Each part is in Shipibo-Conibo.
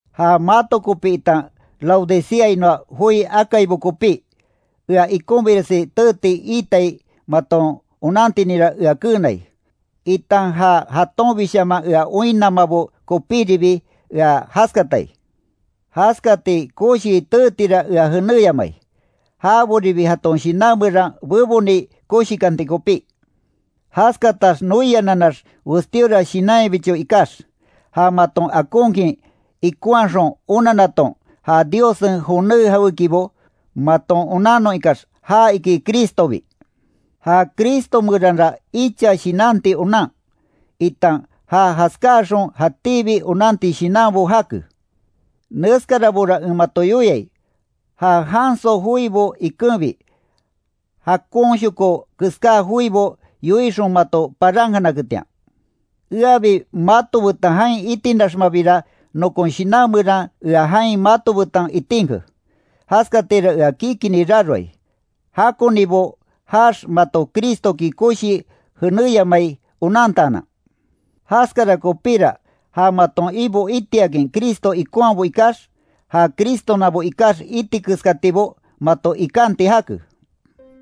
Ja mato kopí itan Laodiceainoa joi akaibo kopí, ea ikonbiresi teeti iitai maton onantininra ea keenai, itan ja jatonbishaman ea oinnamabo kopíribi ea jaskatai. Jaskati koshi teetira ea jenéyamai, jaboribi jaton shinan meran beboni koshikanti kopí. Jaskatax noiananax westíora shinanyabicho ikax, ja maton akonkin ikonhaxon onannaton, ja Diossen joné jawékibo maton onannon ikax ja iki Cristobi. Ja Cristo meranra icha shinanti onan, itan ja jaskáaxon jatíbi onanti shinanbo jake. Neskarabora en mato yoiai, ja janso joibo ikenbi, jakonshoko keská joibo yoixon mato parankanaketian. Eabi mato betan jain itinaxmabira nokon shinan meran ea jain mato betan itinke, jaskatira ea kikini raroai, jakonibo jaax mato Cristoki koshii jenéyamai onantaanan. Jaskara kopíra ja maton Ibo itiakin Cristo ikonhabo ikax, ja Cristonabo ikax iti keskatibo mato ikanti jake,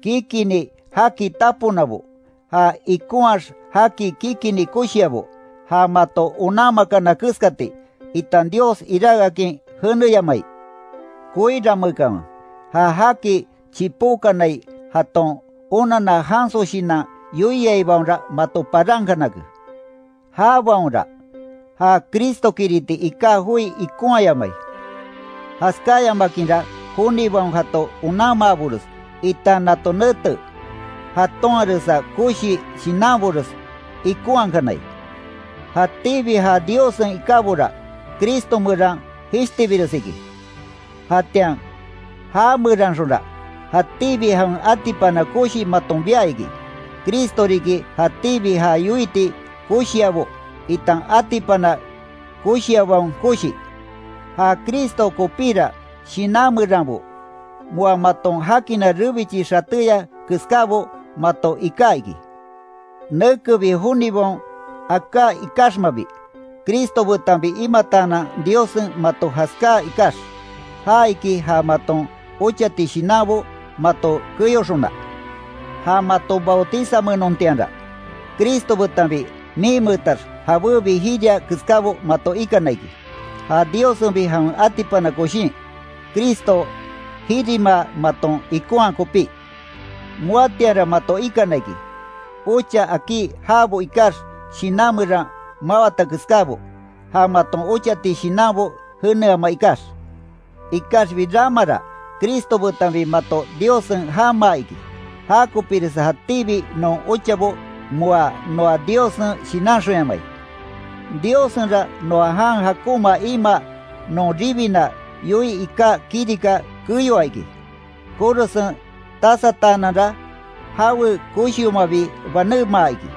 kikini jaki taponabo, ja ikonhaax jaki kikini koshiabo, ja mato onanmakana keskati, itan Dios iráke akin jeneyamai. Koiranmeekanwe; ja jaki chipókanai jaton onanna janso shinan yoiaibaonra mato parankanake. Jabaonra, ja Cristokiriti iká joi ikonhayamai, jaskáyamakinra jonibaon jato onanmaabores, itan nato nete jatonharesa koshi shinanbores ikonhakanai. Jatíbi ja Diossen ikábora, Cristo meran jishtibires iki. Jatian já meranxonra, jatíbi jawen atipana koshi maton bia iki. Cristo riki jatíbi ja yoiti koshiabo, itan atipana koshiabaon koshi. Ja Cristo kopira shinan meranbo, moa maton jakina rebichi xatéya keskábo mato iká iki; nekebi jonibaon aká ikaxmabi, Cristo betanbi imataanan Diossen mato jaskáa ikax; ja iki ja maton ochati shinanbo mato keyoxona. Ja mato bautizanmeenontianra, Cristo betanbi miinmeetax jabébi jiria keskábo mato ikana iki. Ja Diossenbi jawen atipana koshin, Cristo jirimaa maton ikonhaa kopí. Moatianra mato ikana iki, ocha akí jaabo ikax shinan meran mawata keskábo, ja maton ochati shinanbo jeneama ikax. Ikaxbi ramara Cristo betanbi mato Diossen jamaa iki; jakopiresa jatíbi non ochabo moa noa Diossen shinanxonyamai. Diossenra noa jan jakonma imaa non ribina yoii iká kirika keyoa iki. Korosen tasataananra jawe koshiomabi banémaa iki.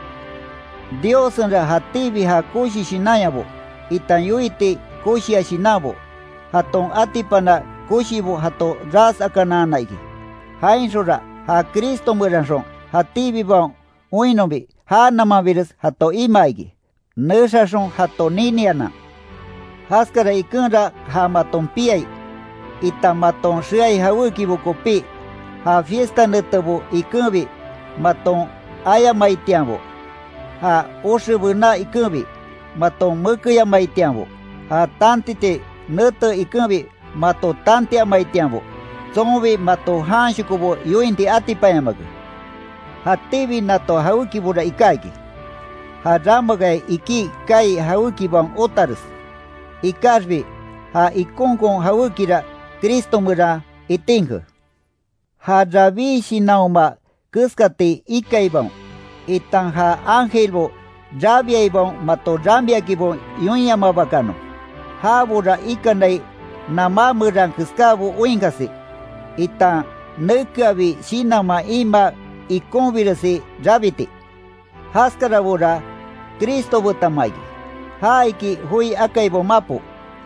Diossenra jatíbi ja koshi shinanyabo, itan yoiti koshia shinanbo, jaton atipana koshibo jato ras akanana iki. Jainxonra ja Cristo meranxon jatíbibaon oinnonbi, já namanbires jato imaa iki, nexaxon jato ninianan. Jaskara ikenra ja maton piai, itan maton xeai jawékibo kopí, ja fiesta netebo ikenbi maton ayamaitianbo, ja oxe bená ikenbi, maton mekeyamaitianbo, ja tantiti nete ikenbi mato tantiamaitianbo, tsonbi mato janshokobo yointi atipanyamake. Jatíbi nato jawékibora iká iki, ja ramakaya ikí kaai jawékibaon otares, ikaxbi ja ikonkon jawékira Cristo meran itinke. Ja rabí shinanhoma keskati ikaibaon, itan ja ángelbo rabiaibaon mato ramiakinbo yoinyamabakanon. Jabora ikanai namá meran keskábo oinkasi, itan nekeabi shinanman imaa ikonbiresi rabiti. Jaskarabora Cristo betanma iki; ja iki joi akaibaon mapo,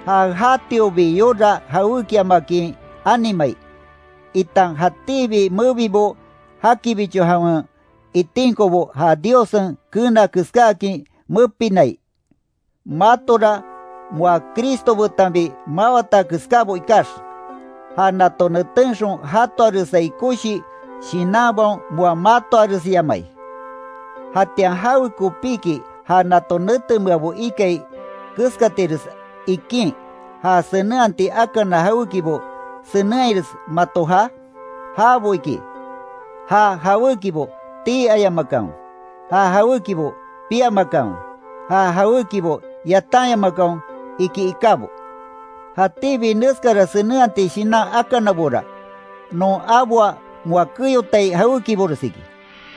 ja jatiobi yora jawékiamakin animai, itan jatíbi mebibo jakibicho jawen itinkobo ja Diossen keena keskáakin mepinai. Matora moa Cristo betanbi mawata keskábo ikax, ja nato netenxon jatoaresai koshi shinanbaon moa matoaresyamai. ¿Jatian jawekopiki ja nato netemeabo ikai keskatires ikín, ja senenhati akana jawékibo senenhaires mato jaa? Jabo iki, “ja jawékibo tii ayamakanwe, ja jawékibo piamakanwe, ja jawékibo yatanyamakanwe”, iki ikábo. Jatíbi neskara senenhati shinan akanabora, non aboa moa keyotai jawékibores iki;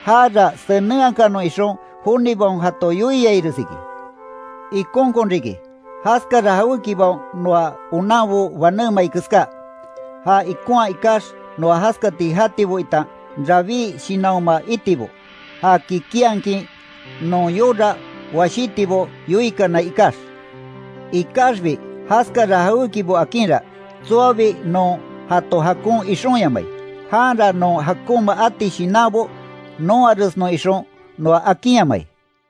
jara senenhakanon ixon jonibaon jato yoiaires iki. Ikonkon riki, jaskara jawékibaon noa onanbo banémai keská. Ja ikonha ikax noa jaskati jatibo itan rabí shinanhoma itibo, ja kikinhakin non yora washítibo yoikanai ikax; ikaxbi jaskara jawékibo akinra, tsoabi non jato jakon ixonyamai; janra non jakonma ati shinanbo nonharesnon ixon noa akinyamai.